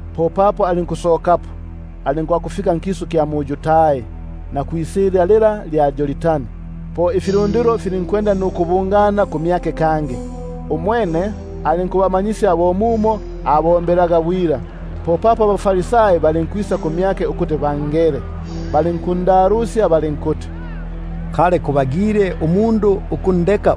Popapo alinkusokapo, alinkwakufika nkisu kya mu-Yudai nisilya lila lya Yordani; po ifilundilo filinkubungana kumyake kangi. Umwene alinkubamanyisya kangi bo mumo abombelaga bwila. Popapo abaFarisai balinkwisa kumyake, balinkundalusya linga kubagile umundu ukundeka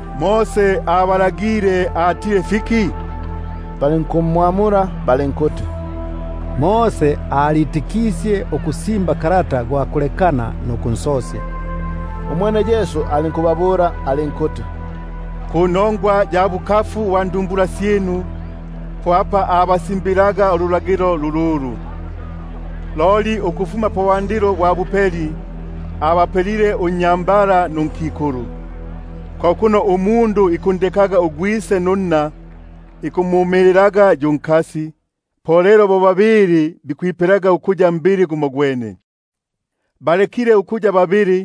Mose abalagile atile fiki? Balinkumwamula balinkuti: Mose alitikisye ukusimba kalata gwa kulekana nukunsosya. Umwene Yesu alinkubabula alinkuti: Panongwa ya bukafu bwa ndu- mbula syinu po apa abasimbilaga ululagilo lululu. Loli ukufuma pabwandilo bwa bupeli, abapelile unnyambala nunkikulu. Ko kuno umundu isakundekaga ugwise nunna, isakumumililaga yu nkasi, lelo bo babili, bababa bisakuyaga mbili gumogwene. Bunobuno lelo halekile ukuya babili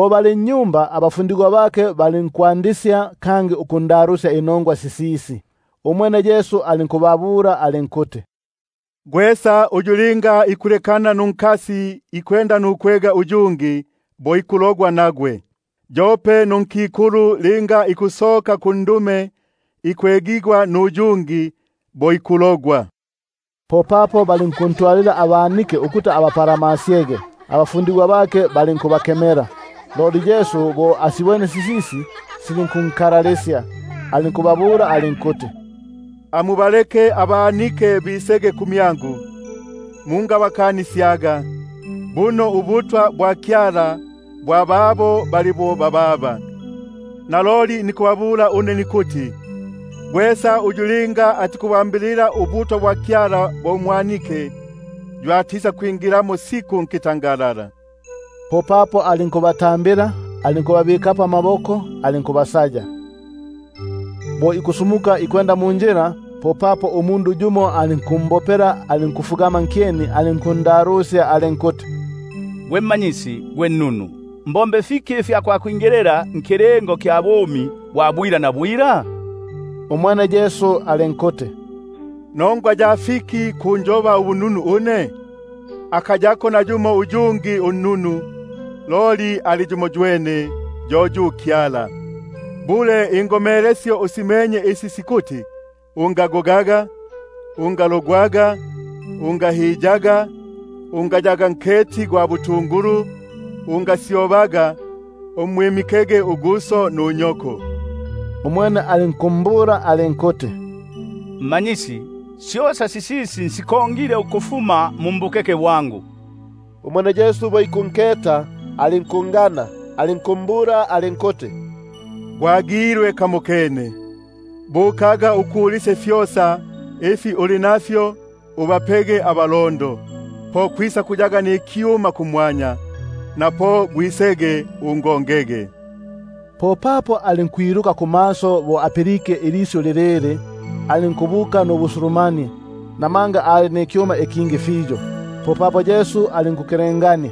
Kangi nnyumba abafundigwa balinkundalusya inongwa sisisi. Umwene alinkubabula alinkuti: Gwesa uyu linga ikulekana nunkasi nukwegana nuyungi, bo alogilwe nagwe. Yope nunkikulu linga ikulekana nundume ikwegana nuyungi, bo alogigwe. Popapo balinkuntwalila abanike ukuti abapalamasyege, abafundigwa balinkubakemela. Loli Yesu bo asibwene, silinkunkalalisya, alinkubabula alinkuti: Amubalekege abanike bisege kumyangu, mungabakanisyaga; buno ubutwa bwa Kyala bwa babo bali bo bababa. Naloli nikubabula une nikuti, gwesa uyu linga atikubwambilila ubutwa bwa Kyala bo umwanike, yo atisakwingilamo siku. Popapo alinkubapagata, alinkubabikapo amaboko alinkubasaya. Bo ikusumuka ikwenda munjila, umundu yumo alinkumbopela, alinkufugama nkyeni mmyake alinkundalusya alinkuti: Gwe Mmanyisi gwe nnunu, mbombe fiki ifya kwakwingilila pakilingo kya bumi bwa bwila? Umwene Yesu alinkuti: Nongwa ya fiki kunjoba ubununu? Akayako nayumo unnunu loli yumoywene, yo yu Kyala. Ingomelesyo usimenye isi sikuti: Ungagogaga, ungalogwaga, ungahiyaga, ungayaga nketi gwa butungulu, ungasyobaga, umwimikege uguso nunyoko. Umwene alinkumbula alinkuti: Mmanyisi, syosa sisisi nsikongile ukufuma mu mbukeke bwangu. Umwene Yesu bo ikunketa alinkungana, alinkumbula alinkuti: Gwagilwe kamokene; bukaga ukulisye fyosa ifi uli nafyo ubapege abalondo, po kwisakuyaga nikyuma kumwanya; na po gwisege ungongege. Popapo alinkwiluka kumaso bo apilike ilisyu lilili, alinkubuka nubusulumanie, namanga ali nikyuma ikingi fiyo. Popapo Yesu alinkukelengania,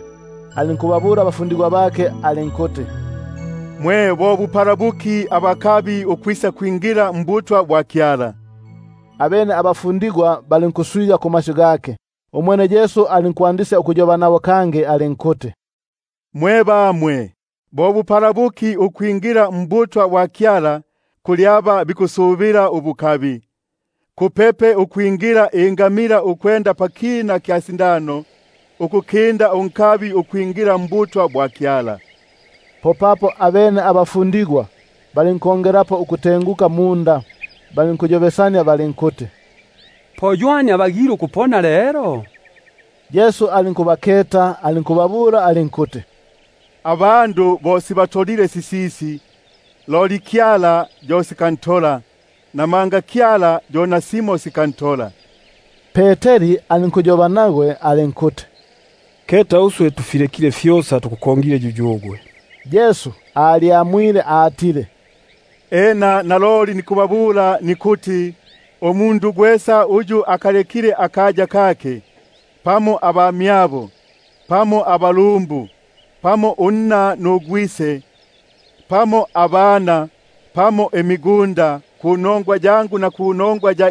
alinkubabula abafundigwa bake alinkuti: Bo bupala buki abakabi ukwisakwingila mbutwa bwa Kyala! Abene abafundigwa balinkuswiga kumasyu gake. Umwene Yesu alinkwandisya ukwamula, alinkuyoba nabo alinkuti: Mwe bamwe, bo bupala buki ukwingila mbutwa bwa Kyala, aba bikusubila pabukabi! Kwayaga kupepe ingamila ukwenda pakina ka sindano, ukukinda unkabi ukwingila mbutwa bwa Kyala. Abene balinkukindilila ukutenguka, balinkuyobesania balinkuti: Po ywani abagile ukupona lelo? Yesu alinkubenesya, alinkubabula alinkuti: Abandu bo sibatolile sisisi, loli Kyala yo sikantola; namanga Kyala yo nasimo sikantola. Popapo Peteri alinkwanda ukuyoba nagwe alinkuti: Keta uswe tufilekile fyosa tukukongile yuyugwe. Umwene Yesu alinkuti: Naloli nikubabula une nikuti, akayako nayumo umundu uyu ayilekile inyumba, pamo abamyabo pamo abalumbu, pamo unna pamo ugwise, pamo abana, pamo imigunda panongwa yangu na panongwa ya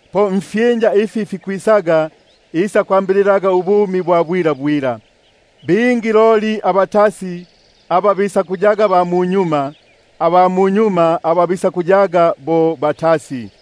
na nkisu iki kikwisaga ubumi bwa bwila. Bingi abatasi bisakuyaga ba munyuma, aba munyuma bisakuyaga batasi.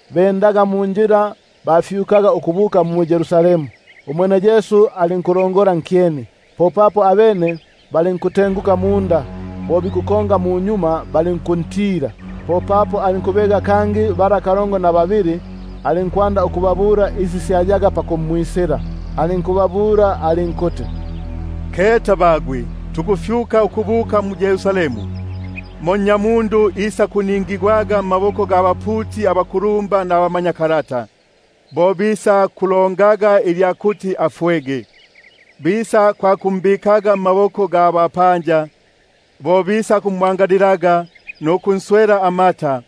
Balinkwenda munjila, balinkufyuka ukubuka mu-Yerusalemu, umwene Yesu alinkulongola nkyeni. Abene balinkuswiganika, naba bakongaga balinkutila. Popapo alinkubega kangi aba kalongo na babili bala, alinkwanda ukubabula isi syayaga pakumwisila. Alinkubabula alinkuti: Keta tukufyuka ukubuka mu-Yerusalemu, mo Nnyamundu isakubikigwaga mmaboko ga baputi abakulumba nabamanyakalata; bo bisakulongaga ilya kuti afwege, bisakwakumbikaga mma- boko ga bapanja; bo bisakumwangalilaga, nukunswela amata,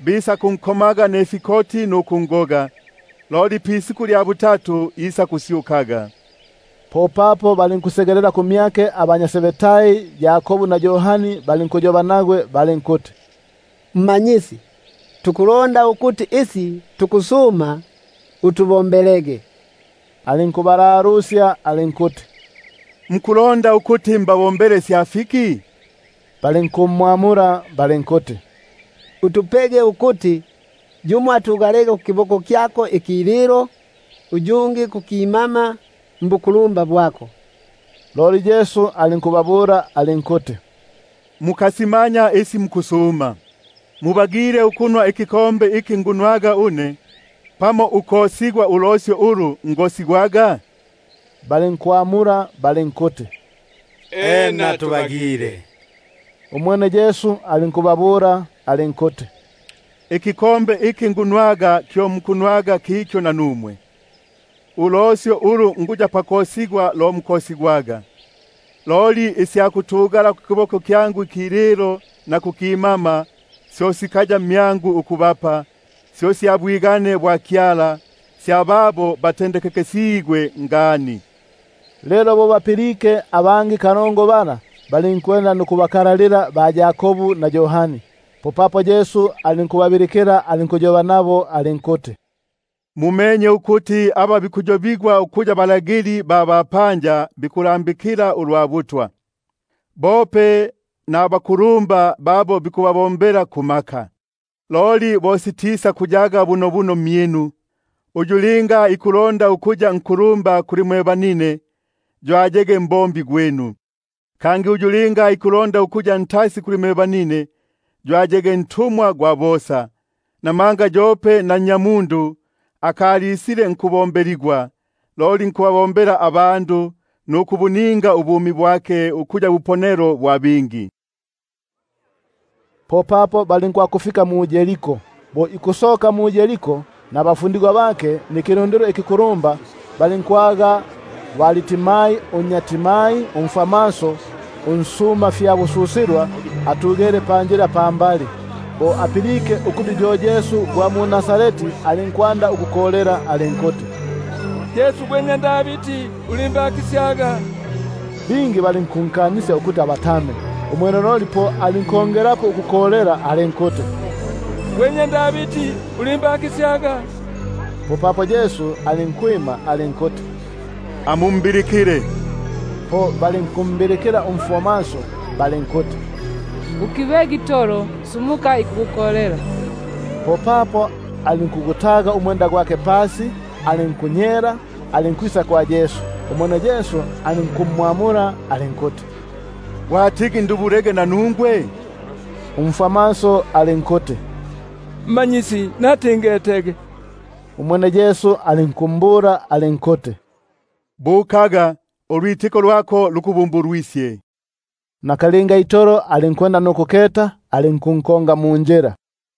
bisakwakunkomaga nifikoti nukungoga; loli pisiku lya butatu isakusyukaga. Popapo balinkusegelela kumyake abanya Zebedai, Yakobu na Yohani, balinkuyoba nagwe balinkuti: Mmanyisi, tuku- londa ukuti isi tukusuma utubombele. Umwene alinkubabula alinkuti: Mwalondaga ukuti mbabombele isya fiki? Balinkuti: Utupege ukuti yumo atugalege kukililo, yumo kuki- mama mbukulumba bwako. Loli Yesu alinkubabula alinkuti: Mukasimanya isi mukusuma. Mubagile ukunwa ikinwelo iki nikuya pakunwa une, pamo ukosigwa ulosyo ulu nikuya pakosigwa une? Balinkuti: Ena tubagile. Umwene Yesu alinkubabula alinkuti: Ikinwelo iki nikunwa nanumwe kyo mwisakunwaga, nulosyo ulu nikosigwa lo mwisakosigwaga; loli isya kutugala kukililo na kukimama kyangu, syo sikaya mmyangu ukubapa, sya babo batendekekesigwe ngani. Lelo bo bapilike aba kalongo bala, balinkwanda ukubaka- lalila ba-Yakobu na Yohani. Popapo Yesu alinkubabilikila, alinkuyoba nabo alinkuti: Mumenye ukuti aba bikuyobigwa ukuya balagili ba bapanja bikubalambikila ulwa butwa, bope nabakulumba babo bikubombela kumaka. Loli bo sitisakuyaga bunobuno mmyinu; uyu linga ikulonda ukuya nku- lumba mmyinu, yo ayege mbombi gwinu, kangi uyu linga ikulonda ukuya ntasi mmyinu, yo ayege ntumwa gwa bosa. Namanga yope na Nnyamundu akalisile nkubombeligwa, loli nkubombela nukubuninga ubumi bwake ukuya buhangi bwa bingi. Popapo balinkufika mu-Yeriko. Bo ikusoka mu-Yeriko nabafundigwa bake nikilundilo ikikulumba, Bartimai unnya Timai, umfwamaso unsuma fyabususilwa, atugele panjila pambali. Bo apilike ukuti yo Yesu gwa mu-Nazareti, alinkwanda ukukolela alinkuti: Yesu gwe nnya Davidi, ulimbakisyaga. Bingi balinkunkanisya ukuti abatame; umwene loli alinkongelapo ukukolela alinkuti: Gwe nnya Davidi, Yesu, ulimbakisyaga. Yesu alinkwima, alinkuti: Amumbilikile. Po balinkumbilikila umfwamaso balinkuti: Ukibege itolo, sumuka ikukukolela. Popapo alinkugutaga umwenda gwake, alinkunyela alinkwisa kwa Yesu. Umwene Yesu alinkumwamula alinkuti: Gwatigi ndubule nanungwe? Umfwamaso alinkumbula alinkuti: Rabuni,#Rabuni, ko kuti gwe Mmanyisi. natigi ngetege. Umwene Yesu alinkumbula alinkuti: Bukaga, ulwitiko lwako lukuponisye. Nakalinga itolo alinkwenda nukuketa, alinkunkonga munjila.